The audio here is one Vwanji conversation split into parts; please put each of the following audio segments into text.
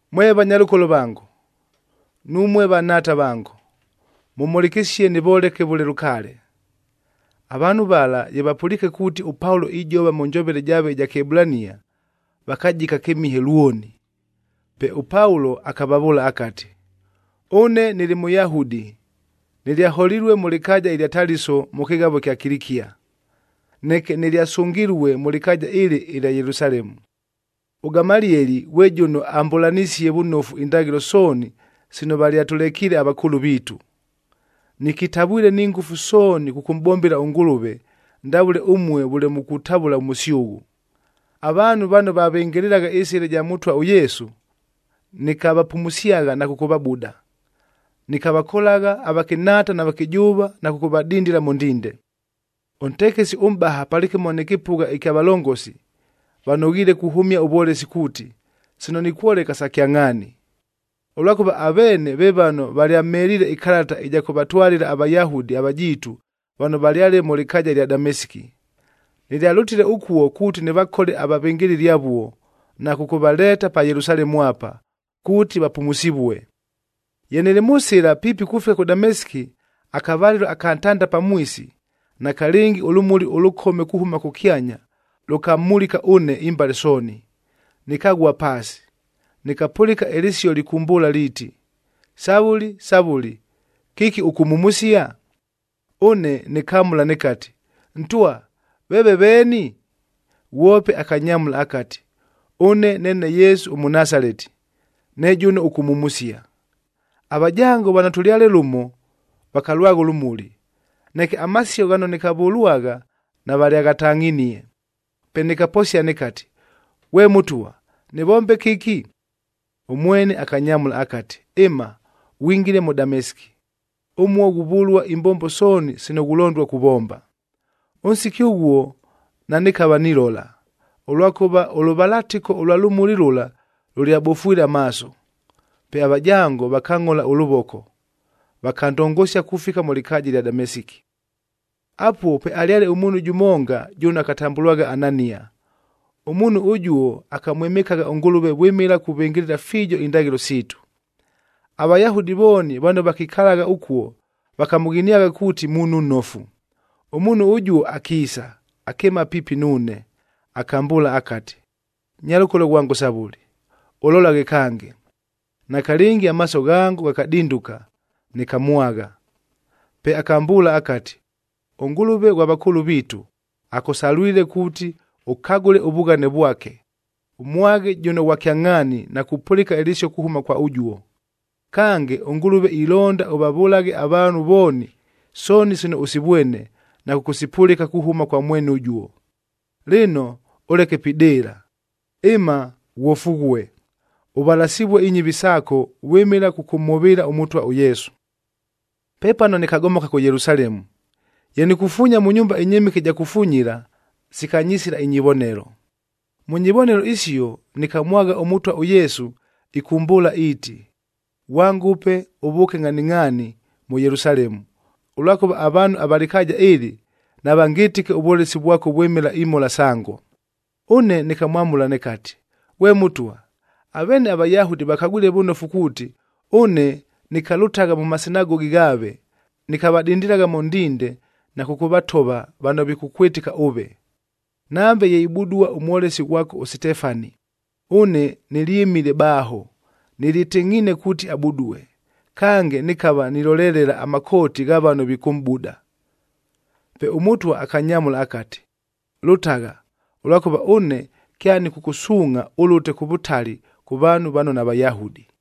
“Mwe vanyalʉkolo vango, numue vanhaata vango, mʉmhʉlɨkɨsie nɨvoleke vʉle lʉkaale.” Avaanhu vala ye vapʉliike kuuti, ʉPaulo ijova mʉ njovele jaave ɨja Kɨebulania, vakajika kɨmihe lwoni. Pe ʉPaulo akavavʉʉla akati, “Ʉne nɨlɨ Mʉyahudi, nɨlyaholilue mʉ lɨkaaja ɨlya Taliso mʉ kɨghavo ɨkya Kilikia. Neke nɨlyasʉngilue mʉ lɨkaaja ɨlɨ ɨlya Yelusalemu. ɄGamalieli ghwe jʉno amʼbʉlanisie vʉnofu indaghɨlo sooni sino valyatʉlekiile avakʉʉlʉ viitu. Nɨkitavwile ni ngʉfu sooni kʉkʉmʼbombela ʉNgʉlʉve, ndavʉle ʉmue vʉle mukutavʉla ʉmʉsyʉghʉ. Avaanhu vano vavɨngɨlɨlagha ɨSɨla ɨja Mʉtwa ʉYesu, nɨkavapumusyagha na kʉkʉvabuda, nɨkavakolagha avakɨnhaata na vakɨjʉʉva na kʉkʉvadindila mʉ ndinde. Ʉntekesi ʉmʼbaha palɨkɨmo nɨ kɨpʉgha ɨkya valongosi, vanoghiile kuhʉmia ʉvwolesi kuuti, sino nikwoleka sa kyangʼhaani. Ʉlwakʉva aveene ve vano valyamheliile ɨkalata ɨja kʉvatwalɨla aVayahudi avajiitu vano valyale mʉ lɨkaaja ɨlya Damesiki. Nɨlyalʉtile ʉkuo kuuti nɨvakole avavɨngɨlɨli avuo, na kʉkʉvaleeta pa Yelusalemu apa, kuuti vapumusivue. “Ye nɨlɨ mʉ sɨla piipi kufika kʉ Damesiki, akavalɨlo aka ntanda pamwisi, nakalɨngi ʉlʉmuli ʉlʉkome kuhʉma kʉkyanya lʉkamulika ʉne imbale sooni. Nɨkaghua paasi, nɨkapʉlɨka ɨlɨsio lɨkʉmbʉʉla liiti, ‘Savʉli, Savʉli, kɨki ʉkʉmhumusia?’ Ʉne nɨkamʉla nɨkati, ‘Ntwa, veeve veeni?’ Ghwope akanyamʉla akati, ‘Ʉne neene Yesu ʉMʉnasaleti, ne jʉno ʉkʉmhumusia.’ Avajango vano tʉlyale lʉmo vakalwagha ʉlʉmuli, neke amasio ghano nɨkavʉlwagha navalyaghatangʼhinie. Pe nɨkaposia nɨkati, ‘Ghwe Mʉtwa, nɨvombe kɨki?’ Ʉmwene akanyamʉla akati, ‘Ɨma, ghwingile mʉ Damesiki. Ʉmuo ghuvʉlua imbombo sooni sino ghulondua kuvomba.’ Ʉnsiki ʉghuo nanɨkava nilola, ʉlwakʉva ʉlʉvalatɨko ʉlwa lʉmuli lʉla lʉlyabofwile amaaso. Pe avajango vakangʼhola ʉlʉvoko, vakandongosia kufika mʉ lɨkaaja ɨlya Damesiki. “Apuo pwealyale ʉmuunhu jʉmonga jʉno akatambʉlwagha Anania. Ʉmuunhu ʉjuo akamwɨmɨkagha ʉNgʉlʉve vwɨmɨla kuvɨngɨlɨla fiijo indaghɨlo siitu. AVayahudi vooni vano vakikalagha ʉkuo vakamʉghiniagha kuuti muunhu nnofu. Ʉmuunhu ʉjuo akiisa, akɨɨma piipi nuune, akambʉʉla akati, ‘Nyalʉkolo ghwango Savʉli, ʉlolaghe kange!’ Nakalɨngi amaaso ghango ghakadinduka, nɨkamwagha. Pe akambʉʉla akati, ‘ɄNgʉlʉve ghwa vakʉʉlʉ viitu, akʉsalwile kuuti ʉkagʉle ʉvughane vwake, ʉmwaghe jʉno Ghwa Kyangʼhaania na kupʉlɨka ɨlɨsio kuhʉma kwa ʉjuo. Kange, ʉNgʉlʉve ilonda ʉvavʉlaghe avaanhu vooni sooni sino ʉsivwene na kʉkʉsipʉlɨka kuhʉma kwa mwene ʉjuo. Lɨno, ʉleke pidɨɨla! Ɨma! Ghwofughue, ʉvalasɨvue inyɨvi saako vwɨmɨla kʉkʉmhʉvɨɨla ʉMʉtwa ʉYesu.’ “Pepano nɨkagomoka kʉ Yelusalemu. Ye nikufuunya mʉ nyumba ɨnyɨmɨke ɨja kufunyila, sikanyisila inyivonelo. Mʉ nyivonelo isio nɨkamwagha ʉMʉtwa ʉYesu, ɨkʉmbʉʉla iiti, ‘Ghwangʉpe, ʉvʉʉke ngʼhaningʼhaani mʉ Yelusalemu, ʉlwakʉva avaanhu ava lɨkaaja ɨlɨ, navangɨtɨke ʉvwolesi vwako vwɨmɨla imhola sango.’ Ʉne nɨkamwamʉla nɨkati, ‘Ghwe Mʉtwa, aveene aVayahudi vakagwile vʉnofu kuuti, ʉne nɨkalʉtagha mʉ masinagogi ghaave, nɨkavadindilagha mʉ ndinde na kʉkʉvatova vano vikʉkwɨtɨka ʉve. Nambe ye ibudua ʉmwolesi ghwako ʉSitefani, ʉne nɨlyɨmile baaho, nɨlyɨtɨngʼhiine kuuti abudue, kange nɨkava nilolelela amakooti gha vano vikʉmʼbuda.’ Pe ʉMʉtwa akanyamʉla akati, ‘Lʉtagha! Ʉlwakʉva ʉne kyanɨkʉkʉsuungʼha ʉlʉte kʉ vʉtali kʉ vaanhu vano naVayahudi.’”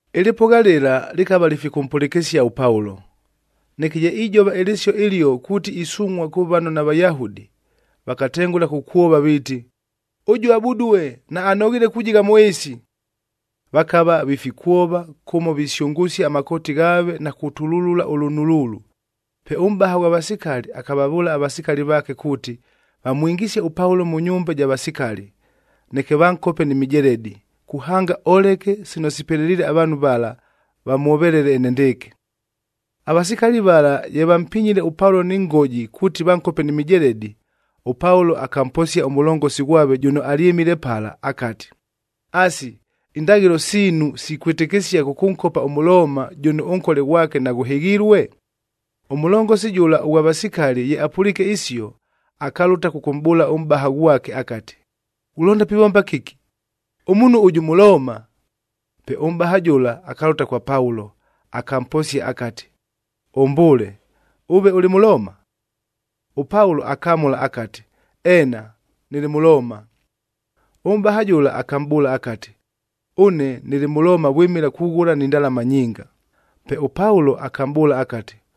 Ɨlɨpʉgha lɨla lɨkava lifikʉmpʉlɨkɨsia ʉPaulo. Neke ye ijova ɨlɨsio ɨlio kuuti isungʼhua kʉ vano naVayahudi, vakatengʉla kukwova viiti, “Ʉjuo abudue, naanoghiile kujigha mʉ ɨɨsi!” Vakava vifikwova kʉmo visyʉngʉsia amakooti ghaave na kutululula ʉlʉnuluulu.b Pe ʉmʼbaha ghwa vasikali akavavʉʉla avasikali vaake kuuti, vamwingisie ʉPaulo mʉ nyumba ɨja vasikali, neke vankope ni mijeledi, kuhanga oleke sino sipeleliile avaanhu vala vamwovelele enendɨɨkɨ. Avasikali vala ye vampinyile ʉPaulo ni ngoji kuuti vankope ni mijeledi, ʉPaulo akamposia ʉmʉlongosi ghwave jʉno alyɨmile pala akati, “Asi, indaghɨlo siinuc sikwɨtɨkɨsia kʉkʉnkopa ʉMʉlooma jʉno ʉnkole ghwake naghʉhɨghilue?” Ʉmʉlongosi jʉla ʉghwa vasikali ye apʉliike isio, akalʉta kʉkʉmʼbʉʉla ʉmʼbaha ghwake akati, “Ghulonda pivomba kɨki? Ʉmuunhu ʉjʉ Mʉlooma!” Pe ʉmʼbaha jʉla akalʉta kwa Paulo, akamposia akati, “Ʉmbʉʉle, ʉve ʉlɨ Mʉlooma?” ɄPaulo akamʉla akati, “Eena, nɨlɨ Mʉlooma.” Ʉmʼbaha jʉla akamʼbʉʉla akati, “Ʉne nɨlɨ Mʉlooma vwɨmɨla kughʉla ni ndalama nyinga.” Pe ʉPaulo akamʼbʉʉla akati,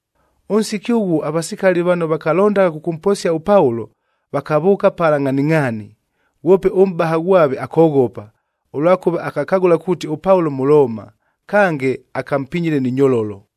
Ʉnsiki ʉghuo avasikali vano vakalondagha kʉkʉmposia ʉPaulo, vakavʉʉka pala ngʼhaningʼhaani. Ghwope ʉmʼbaha ghwave akoghopa, ʉlwakʉva akakagʉla kuuti ʉPaulo Mʉlooma, kange akampinyile ni nyololo.